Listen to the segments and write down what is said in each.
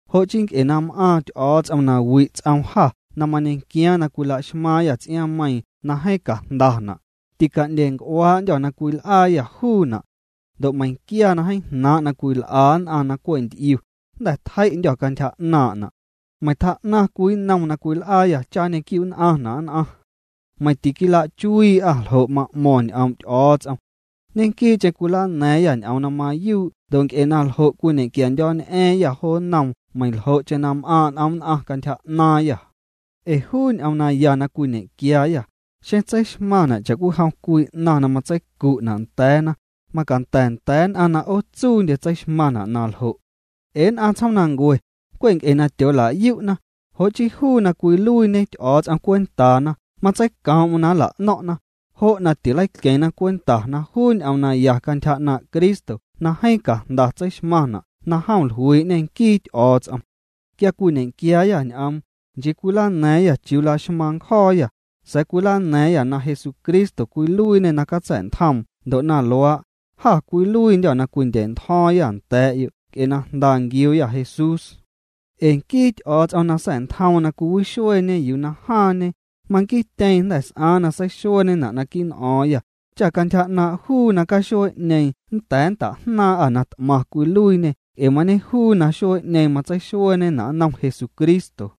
Jo' chii nc'e na m'aaⁿ Ty'o̱o̱ts'om na wi' ts'oom jâ na mañequiaaⁿ na cwilaxmaaⁿyâ ts'iaaⁿmeiiⁿ na jeeⁿ cajndana', tica'ndya̱a̱nc'uaa'ndyô̱ na cwil'aayâ juuna'. Ndo' meiⁿquia na jeeⁿ jnaaⁿ' na cwil'a nn'aⁿ na cwe' nty'iu, jnda̱ tjei'ndyô̱ cantyja 'naaⁿna'. Meiⁿ tjaa'naⁿ cwii nnom na cwil'aayâ cha nñequiu'nn'aⁿna' nn'aⁿ. Meiⁿ tiquilachuii'â ljo' na ma'mo̱ⁿ ñ'oom' Ty'o̱o̱ts'om. Ñequii'cheⁿ cwilana̱a̱ⁿyâ ñ'oom na mayuu' ndo' nc'e na ljo' cwiñe'quiandyo̱ñ'a̱a̱ⁿyâ jo nnoom meiⁿljo'cheⁿ na m'aaⁿ' n'om nn'aⁿ cantyja 'naaⁿyâ. Ee juu ñ'oom naya na cwiñe'quiaayâ, xeⁿ tseixmaⁿna' cha'cwijom cwii 'naⁿ na matseicu'na' nda̱a̱na, macanda̱ nda̱a̱ nn'aⁿ na 'ootsuundye tseixmaⁿna' na ljo'. Ee nn'aⁿ tsjoomnancue, cwe' nc'e na tyoola'yu'na, jo' chii juu na cwiluiiñe Ty'o̱o̱ts'om cwentaana matseicoom'm na nla'no̱ⁿ'na, jo' na tileiqueⁿna cwenta na juu ñ'oom naya cantyja 'naaⁿ' Cristo na jeeⁿ cajnda tseixmaⁿna' na jom jluii'ñê nquii Ty'o̱o̱ts'om. Quia cwiñequiaayâ ñ'oom, nchii cwilana̱a̱ⁿyâ chiuu laxmaaⁿ ncjo̱o̱yâ, sa̱a̱ cwilana̱a̱ⁿyâ na Jesucristo cwiluiiñê na catsa̱'ntjoom ndo' na luaa', jâ cwiluiindyô̱ na cwindya̱'ntjo̱o̱ⁿyâ nda̱a̱'yo' nc'e na jnda nquiuuyâ Jesús. Ee nquii Ty'o̱o̱ts'om na sa̱'ntjoom na cwixueeñe yuu na jaaⁿñe, manquiityeeⁿ jnda̱ s'aaⁿ na seixueeñena' naquii' n'o̱o̱ⁿyâ, cha cantyja 'naaⁿ' juu na caxuee'ñeeⁿ nnda̱a̱ nnta'jnaaⁿ'â na t'maⁿ cwiluiiñê nc'e mañejuu na xuee'ñeeⁿ matseixueeñena' nnom Jesucristo.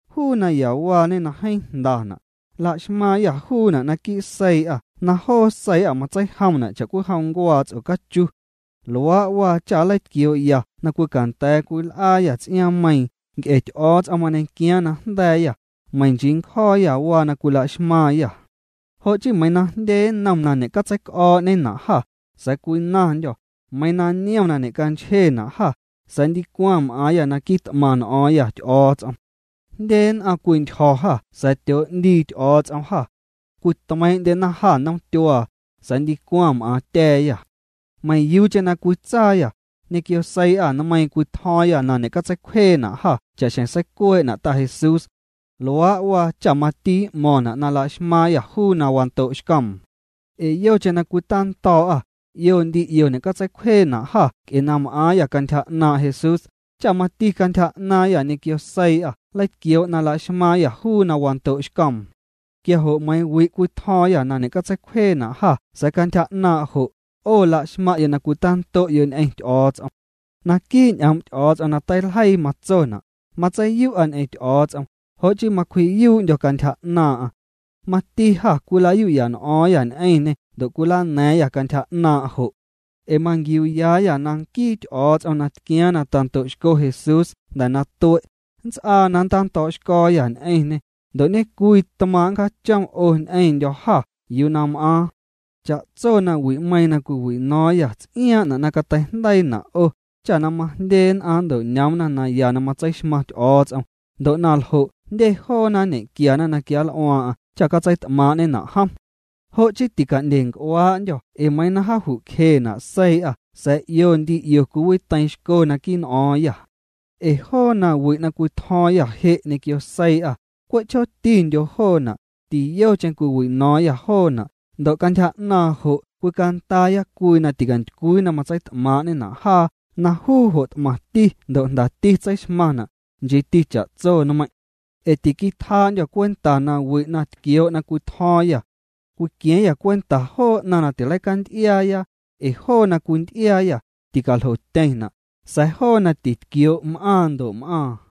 Juu nayawaañe na jeeⁿ jndana', la'xmaaⁿyâ juuna' naquii' seii'â na joo seii'â matseijomna' cha'cwijom ncuaa ts'ocachu. Luaa' waa cha nleitquioo'ya na cwicanda̱a̱ cwil'aayâ ts'iaaⁿmeiiⁿ nc'e Ty'o̱o̱ts'om mañequiaaⁿ na jnda̱a̱yâ, meiⁿ nchii ncjo̱o̱yâ waa na cwila'xmaaⁿyâ. Jo' chii meiiⁿ na jndye nnom na ñe'catseic'o̱o̱'na' jâ, sa̱a̱ cwinaⁿndyô̱, meiiⁿ niom na ñe'canchjena' jâ, sa̱a̱ ndicwaⁿ m'aaⁿyâ na quit'maⁿ n'o̱o̱ⁿyâ Ty'o̱o̱ts'om. Jndye nn'aⁿ cwintyjo̱ jâ sa̱a̱ tyoo'ndii Ty'o̱o̱ts'om jâ. Cwitmeiiⁿ'ndyena jâ nnom tyuaa, sa̱a̱ ndicwaⁿ m'aaⁿtya̱a̱yâ. Meiⁿyuucheⁿ na cwitsaayâ, ñequio seii'â nmeiiⁿ cwitjo̱o̱ⁿyâ na ñe'catseicwjeena' jâ cha'xjeⁿ seicuee'na' Ta Jesús. Luaa' waa cha mati m'mo̱ⁿna' na la'xmaaⁿyâ juu na wando'xcoom. Ee yocheⁿ na cwitando̱o̱'â, 'io ndi 'io ñe'catseicwjeena' jâ nc'e na m'aaⁿyâ cantyja 'naaⁿ' Jesús, cha mati cantyja 'naaⁿyâ ñequio seii'â nleitquioo' na la'xmaaⁿyâ juu na wando'xcoom. Quia jo' meiiⁿ wi' cwitjo̱o̱ⁿyâ na ñe'catseicwjeena' jâ sa̱a̱ cantyja 'naaⁿ' jo', 'o la'xmaⁿ'yo' na cwitando'yo' ñ'eⁿ Ty'o̱o̱ts'om. Naquii' ñ'oom' Ty'o̱o̱ts'om na teiljeii matsona': “Matseiyu'a ñ'eⁿ Ty'o̱o̱ts'om, jo' chii macwji'yuu'ndyo̱ cantyja 'naaⁿ'aⁿ.” Mati jâ cwilayu'ya n'o̱o̱ⁿyâ ñ'eⁿñê ndo' cwilana̱a̱ⁿyâ cantyja 'naaⁿ' jo'. Ee manquiuuyaayâ na nquii Ty'o̱o̱ts'om na tquiaaⁿ na tando'xco Jesús jnda̱ na tue', nnts'aa na nntando̱o̱'xco̱o̱yâ ñ'eⁿñê, ndo' ñecwii tmaaⁿ' nncjachom 'o ñ'eⁿndyo̱ jâ yuu na m'aaⁿ. Cha'tso nawi'meiiⁿ na cwiwino̱o̱ⁿyâ ts'iaaⁿ'na' na cateijndeiina' 'o, cha na majndye nn'aⁿ nnto'ñoomna naya na matseixmaⁿ Ty'o̱o̱ts'om, ndo' na ljo' jndye joona nñequiana na quianl'uaaⁿ'aⁿ cha catseit'maaⁿ'ñena' jom. Jo' chii tica'ndyenc'uaa'ndyô̱ ee meiiⁿ na jaaju'cjena' seii'â sa̱a̱ 'io ndi 'io cwiwiteiiⁿxco naquii' n'o̱o̱ⁿyâ. Ee joo nawi' na cwitjo̱o̱ⁿyâ je' ñequio seii'â, cwe' chjootindyo joona', tiyocheⁿ cwiwino̱o̱ⁿyâ joona' ndo' cantyja 'naaⁿ jo' cwicandaaya cwii na tintycwii na matseit'maaⁿ'ñena' jaa na juu jo' t'maⁿti ndo' jndati tseixmaⁿna', nchiiti cha'tso nmeiⁿ'. Ee tiquitjaa'ndyô̱ cwenta na wi' na tquioo' na cwitjo̱o̱ⁿyâ. Cwiqua̱a̱ⁿyâ cwenta joo 'naⁿ na tileicanty'iaaya, ee joo na cwinty'iaayâ, ticaljotyeⁿna', sa̱a̱ joo na titquioo' m'aaⁿ ndo' m'aaⁿ.